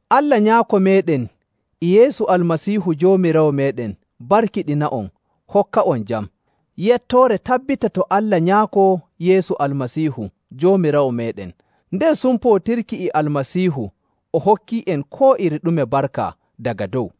Allah Nyaako meeɗen e Yeesu Almasiihu Joomiraawo meeɗen barkiɗina'on, hokka'on jam. Yettoore tabbita to Allah Nyaako Yeesu Almasiihu Joomiraawo meeɗen. Nder sumpootirki e Almasiihu o hokkii'en koo iri ɗume barka daga dow.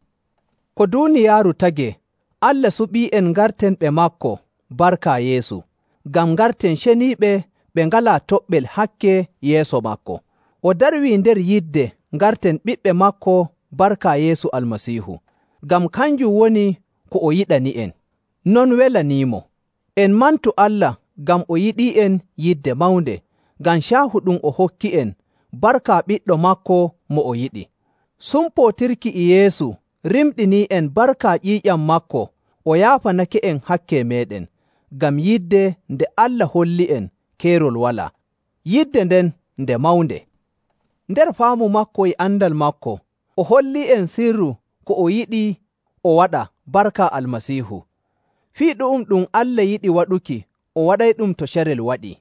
Ko duuniyaaru tagee, Allah suɓii'en ngarten ɓe maako barka Yeesu, ngam ngarten ceniiɓe ɓe ngalaa toɓɓel hakke yeeso maako. O darwii nder yidde ngarten ɓiɓɓe maako barka Yeesu Almasiihu, ngam kanjum woni ko o yiɗani'en. Non welaniimo. En mantu Allah ngam o yiɗii'en yidde mawnde, ngam caahu ɗum o hokki'en barka ɓiɗɗo maako mo o yiɗi. Sumpootirki e Yeesu rimɗinii'en barka ƴiiƴam maako o yaafanake'en hakke meeɗen, ngam yidde nde Allah holli'en keerol walaa. Yidde nden nde mawnde.. Nder faamu maako e andal maako, o hollii'en sirru ko o yiɗi o waɗa barka Almasiihu. Fii ɗu'um ɗum Allah yiɗi waɗuki o waɗayɗum to carel waɗii.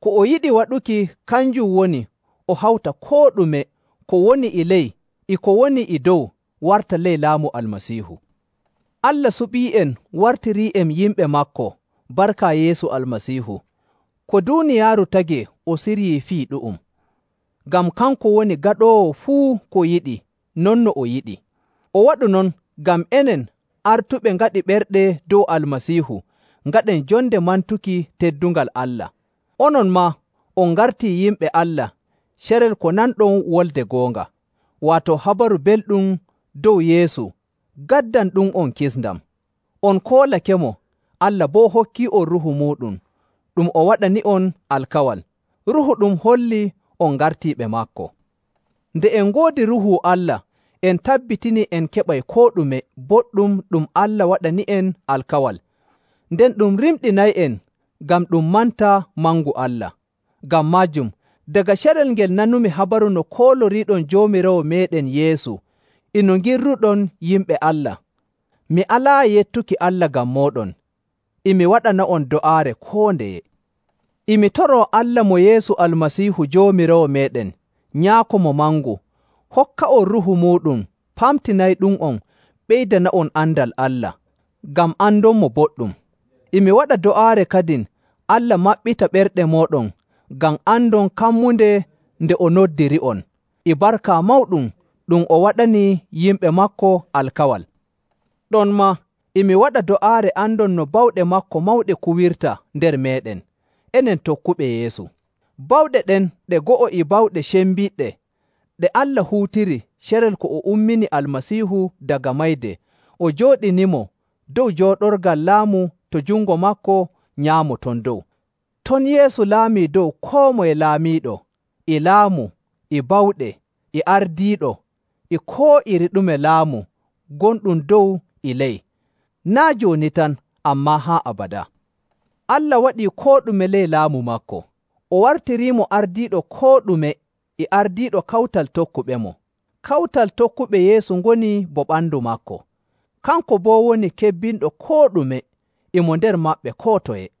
Ko o yiɗi waɗuki kanjum woni o hawta koo ɗume ko woni e ley e ko woni e dow warta ley laamu Almasiihu. Allah suɓii'en wartirii'en yimɓe maako barka Yeesu Almasiihu. Ko duuniyaaru tagee o siryii fii ɗu'um, ngam kanko woni gaɗoowo fuu ko yiɗi non no o yiɗi. O waɗu non ngam enen, artuɓe ngaɗi ɓerɗe dow Almasiihu, ngaɗen jonde mantuki teddungal Allah. Onon maa, on ngartii yimɓe Allah carel ko nanɗon wolde goonga, waato Habaru Belɗum dow Yeesu gaddanɗum'on kisndam. On koolakemo, Allah boo hokkii'on Ruuhu muuɗum ɗum o waɗani'on alkawal. Ruuhu ɗum hollii on ngartii ɓe maako. Nde en ngoodi Ruuhu Allah, en tabbitinii en keɓay koo ɗume boɗɗum ɗum Allah waɗani'en alkawal. Nden ɗum rimɗinay'en ngam ɗum manta mangu Allah. Ngam maajum, daga carel ngel nanumi habaru no kooloriiɗon Joomiraawo meeɗen Yeesu e no ngirruɗon yimɓe Allah, mi alaayi yettuki Allah ngam mooɗon, e mi waɗana'on do'aare koo ndeye. E mi toroo Allah mo Yeesu Almasiihu Joomiraawo meeɗen, Nyaako mo mangu, hokka'on Ruuhu muuɗum pamtinayɗum'on ɓeydana'on andal Allah, ngam andonmo boɗɗum. E mi waɗa do'aare kadin Allah maɓɓita ɓerɗe mooɗon ngam andon kammunde nde o noddiri'on e barka mawɗum ɗum o waɗani yimɓe maako alkawal. Ɗonmaa, e mi waɗa do'aare andon no bawɗe maako mawɗe kuwirta nder meeɗen, enen tokkuɓe Yeesu. Bawɗe ɗen ɗe go'o e bawɗe cembiɗɗe ɗe Allah huutiri carel ko o ummini Almasiihu daga mayde o jooɗinimo dow jooɗorgal laamu to jungo maako nyaamo ton dow.. Ton Yeesu laamii dow koo moye laamiiɗo, e laamu, e bawɗe, e ardiiɗo, e koo iri ɗume laamu gonɗum dow e ley, naa' jooni tan, ammaa haa abadaa. Allah waɗii koo ɗume ley laamu maako. O wartiriimo ardiiɗo koo ɗume e ardiiɗo kawtal tokkuɓemo.. Kawtal tokkuɓe Yeesu ngoni bo ɓandu maako. Kanko boo woni kebbinɗo koo ɗume, e mo nder maɓɓe koo toye..